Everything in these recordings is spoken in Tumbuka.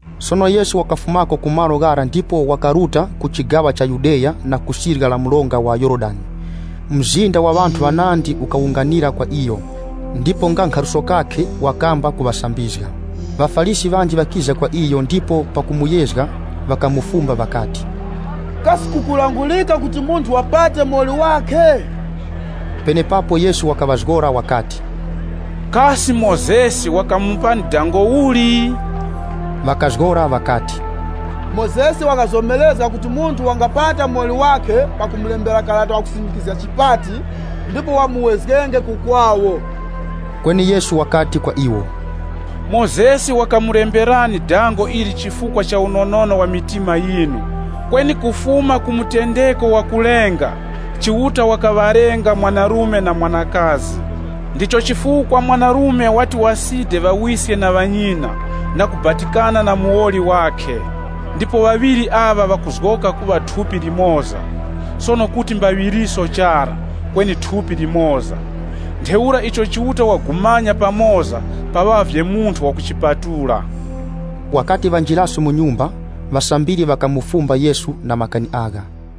Sono Yesu wakafumako ku malo ghara ndipo wakaruta ku chigaŵa cha Yudeya na ku sirya linyakhe la mronga wa Yorodani. Mzinda wa ŵanthu ŵanandi ukawunganira kwa iyo, ndipo nga nkhaluso kakhe, wakamba kuŵasambizga. ŴaFarisi ŵanji ŵakiza kwa iyo ndipo pakumuyezga ŵakamufumba ŵakati, “Kasi kukulangurika kuti munthu wapate muwoli wakhe?” Penepapo Yesu wakaŵazgora wakati, “Kasi icho Mozesi wakamulangulani nchivichi?” Ŵakazgora ŵakati, “Mozesi wakazomerezga kuti munthu wangapata muwoli wakhe pakumulembera karata wa chipati, ndipo wamupatenge.” Kweni Yesu wakati kwa iwo, “Mozesi wakamulemberani dango ili chifukwa cha unonono wa mitima yinu. Kweni kufuma ku mutendeko wakulenga, ‘Chiuta wakaŵalenga mwanarume na mwanakazi. Ndicho chifukwa mwanarume wati wasidenge ŵawiske na ŵanyina na kubatikana na muwoli wakhe. Ndipo ŵaŵiri aŵa ŵakuzgoka kuŵa thupi limoza.’ Sono kuti mbaŵiriso chara, kweni thupi limoza. Ntheura icho Chiuta wagumanya pamoza, paŵavye munthu wakuchipatula.” Wakati wanjiraso mu nyumba, ŵasambiri ŵakafumba Yesu na makani agha.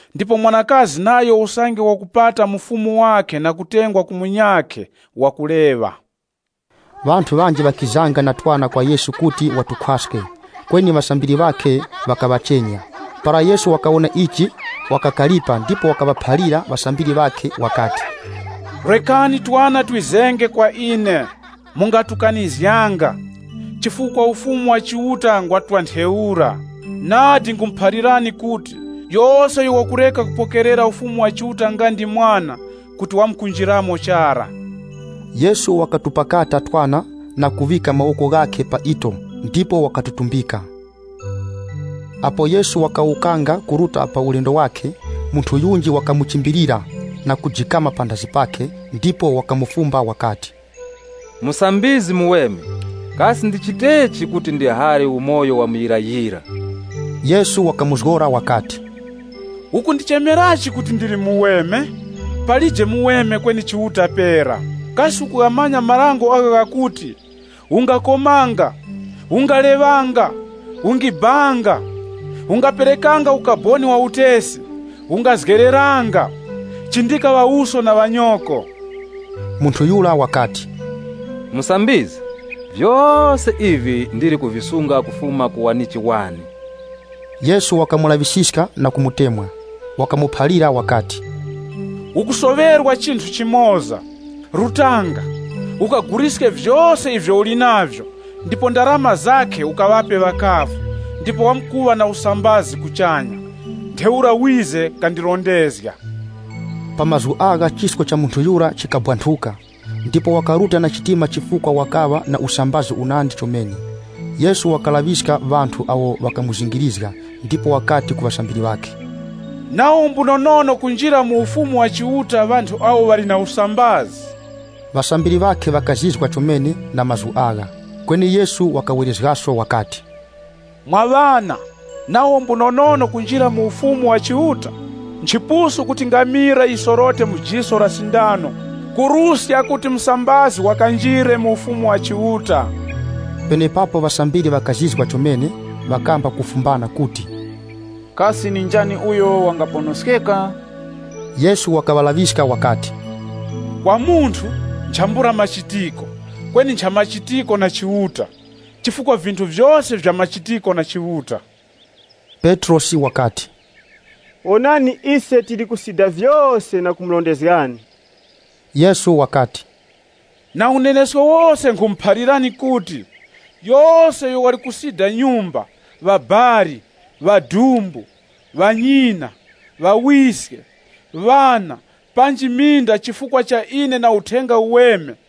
Ndipo mwanakazi nayo usange wakupata mufumu wakhe na kutengwa ku munyakhe wakuleŵa.” Ŵanthu ŵanji ŵakizanga na twana kwa Yesu kuti watukhwaske, kweni ŵasambiri ŵakhe ŵakaŵachenya. Para Yesu wakawona ichi wakakaripa ndipo wakaŵaphalira ŵasambiri ŵakhe wakati, “Rekani twana twizenge kwa ine, mungatukanizganga, chifukwa Ufumu wa Chiuta ngwa twa ntheura. Nadi nkhumuphalirani kuti, yose uyo wakureka kupokerera Ufumu wa Chiuta nga ndi mwana, kuti wamkunjiramo chara.” Yesu wakatupakata twana na kuŵika mawoko ghakhe pa ito ndipo wakatutumbika. Apo Yesu wakawukanga kuruta pa ulendo wakhe, munthu yunji wakamuchimbilira na kujikama panthazi pakhe ndipo wakamufumba wakati, “Musambizgi muweme, kasi ndichitechi kuti ndihare umoyo wa muyirayira?” Yesu wakamuzgora wakati, “Ukundichemerachi kuti ndili muweme? Palije muweme kweni Chiuta pera. Kasi ukughamanya marango agho ghakuti, ‘Ungakomanga, Ungaleŵanga, Ungibanga, Ungaperekanga ukaboni wa utesi, Ungazgereranga, Chindika ŵawuso na ŵanyoko.’” Munthu yura wakati, “Musambizgi, vyose ivi ndili kuvisunga kufuma ku wanichi wane.” Yesu wakamulaŵisiska na kumutemwa. Wakamuphalira wakati, “Ukusoŵerwa chinthu chimoza. Rutanga, ukaguliske vyose ivyo uli navyo ndipo ndarama zakhe ukaŵape ŵakavu, ndipo wamkuŵa na usambazi kuchanya. Ntheura wize kandirondezge.” Pa mazgu agha chisko cha munthu yura chikabwanthuka. Ndipo wakaruta wali na chitima chifukwa wakaŵa na musambazi chomene. Yesu wakalaŵiska ŵanthu awo ŵakamuzingirizga ndipo wakati ku ŵasambiri ŵakhe, “Nawo mbunonono kunjira mu Ufumu wa Chiuta ŵanthu awo ŵali na usambazi!” Ŵasambiri ŵakhe ŵakazizwa chomene na mazgu agha. Kweni Yesu wakawerezgaso wakati, “Mwa ŵana, nawo mbunonono kunjira mu Ufumu wa Chiuta! Nchipusu kuti ngamila yisorote mu jiso la sindano kuruska kuti musambazi wakanjire mu Ufumu wa Chiuta.” Penepapo ŵasambiri ŵakazizwa chomene, ŵakamba kufumbana kuti, “Kasi ndi njani uyo wangaponoskeka?” Yesu wakaŵalaŵiska wakati, “Kwa munthu, nchambula machitiko, kweni nchamachitiko na Chiuta. Chifukwa vinthu vyose nvyamachitiko na Chiuta.” Petrosi wakati, “Wonani ise tili kusida vyose na kumurondezgani.” Yesu wakati, “Na unenesko wose nkhumuphalirani kuti, yose uyo wali kusida nyumba, ŵabali, ŵadumbu, ŵanyina, ŵawiske, ŵana, panji minda chifukwa cha ine na Uthenga Uweme,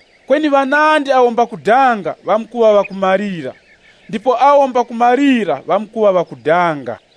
Kweni ŵanandi awo mbakudanga ŵamkuŵa ŵakumalira, ndipo awo mbakumalira ŵamkuŵa ŵakudanga.”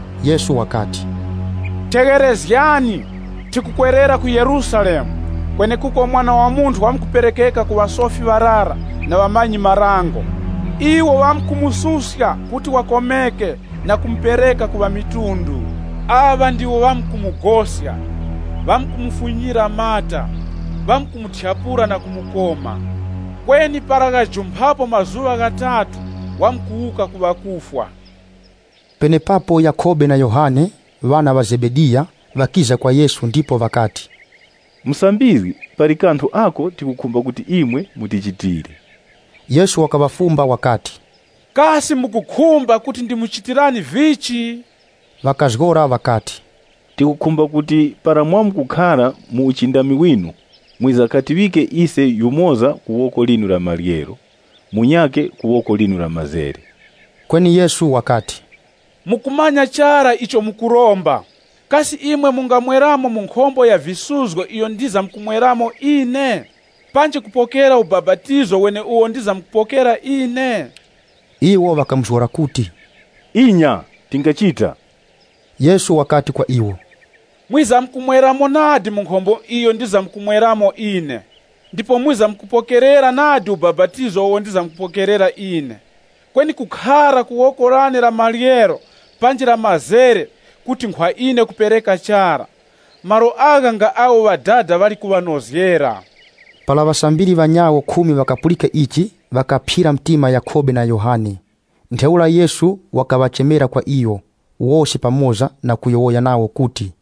Yesu wakati, “Tegherezgani, tikukwerera ku Yerusalemu, kwenekuko Mwana wa Munthu wamkuperekeka ku ŵasofi ŵarara na ŵamanyi-marango. Iwo ŵamkumususka kuti wakomeke na kumupereka ku ŵamitundu. Aŵa ndiwo ŵamkumugoska, ŵamkumufunyira mata, kumuthyapula na kumukoma. Kweni para ghajumphapo mazuŵa ghatatu wamkuwuka ku ŵakufwa.” Penepapo Yakhobe na Yohane, ŵana ŵa Zebediya, ŵakiza kwa Yesu ndipo ŵakati, “Musambizgi, pali kanthu ako tikukhumba kuti imwe mutichitire.” Yesu wakaŵafumba wakati, “Kasi mukukhumba kuti ndimuchitirani vichi?” Ŵakazgora ŵakati, “Tikukhumba kuti para mwamkukhara mu uchindami winu, mwizakatiŵike ise yumoza ku woko linu la maryero munyakhe ku woko linu la mazere.” Kweni Yesu wakati, “Mukumanya chara icho mukuromba. Kasi imwe mungamweramo mu nkhombo ya visuzgo iyo ndizamkumweramo ine, panji kupokera ubapatizo weneuwo ndizamkupokera ine?” Iwo ŵakamuzgora kuti, “Inya, tingachita.” Yesu wakati kwa iwo, “Mwizamkumweramo nadi mu nkhombo iyo ndizamkumweramo ine, ndipo mwizamkupokerera nadi ubapatizo uwo ndizamkupokerera ine. Kweni kukhara ku woko lane la maryero panji la mazere kuti nkhwa ine kupereka chara. Malo agha nga awo Ŵadada ŵali kuŵanozgera.” Para ŵasambiri ŵanyawo khumi ŵakapulika ichi, ŵakaphyira mtima Yakhobe na Yohane. Ntheura Yesu wakaŵachemera kwa iyo wose pamoza na kuyowoya nawo kuti,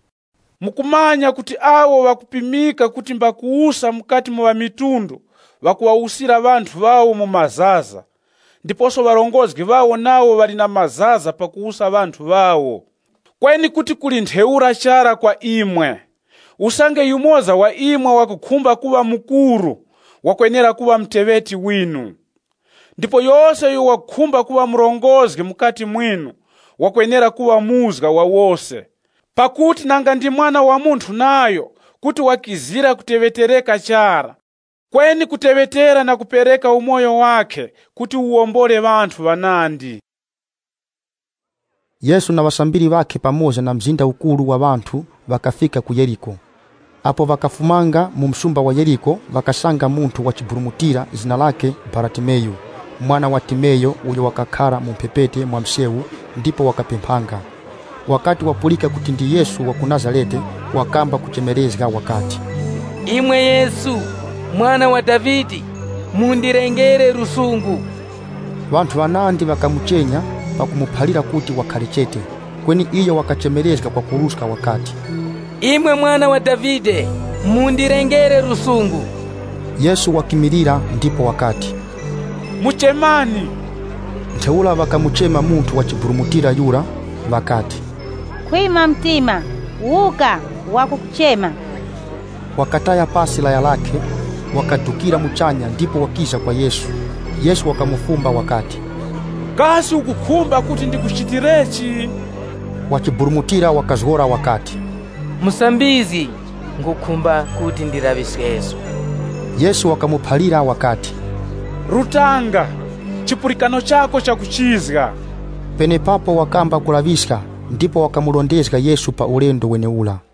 “Mukumanya kuti awo ŵakupimika kuti mbakuwusa mukati mu ŵamitundu, ŵakaŵawusira ŵanthu ŵawo mu mazaza, ndiposo ŵarongozgi ŵawo nawo ŵali na mazaza pakuwusa ŵanthu ŵawo. Kweni kuti kuli ntheura chara kwa imwe. Usange yumoza wa imwe wakukhumba kuŵa mukuru, wakwenera kuŵa muteŵeti winu. Ndipo yose uyo wakukhumba kuŵa murongozgi mukati mwinu, wakwenera kuŵa muzga wa wose. Pakuti nanga ndi Mwana wa Munthu nayo kuti wakizira kuteŵetereka chara kweni kuteŵetera na kupereka umoyo wakhe kuti uwombole ŵanthu ŵanandi.” Yesu na ŵasambiri ŵakhe pamoza na mzinda ukuru wa ŵanthu ŵakafika ku Yeriko. Apo ŵakafumanga mu msumba wa Yeriko, ŵakasanga munthu wa chiburumutira zina lakhe Baratimeyu, mwana wa Timeyo uyo wakakhara mu mphepete mwa msewu ndipo wakapemphanga. Wakati wapulika kuti ndi Yesu wa ku Nazarete, wakamba kuchemerezga wakati, “Imwe Yesu, Mwana wa Davide, mundilengere lusungu!” Ŵanthu ŵanandi ŵakamuchenya pakumuphalira kuti wakhare chete. Kweni iyo wakachemerezga kwakuruska wakati, “Imwe Mwana wa Davide, mundilengere lusungu!” Yesu wakimilira ndipo wakati, “Muchemani.” Ntheura ŵakamuchema munthu wa chiburumutira yura, ŵakati, “Khwima mtima! Wuka, wakukuchema.” Wakataya pasi laya lakhe, wakadukira muchanya ndipo wakiza kwa Yesu. Yesu wakamufumba wakati, “Kasi ukukhumba kuti ndikuchitirechi?” Wachiburumutira wakazgora wakati, “Musambizgi, nkhukhumba kuti ndilaŵiskeso.” Yesu wakamuphalira wakati, “Rutanga, chipulikano chako chakuchizga.” Penepapo wakamba kulaŵiska ndipo wakamurondezga Yesu pa ulendo wenewura.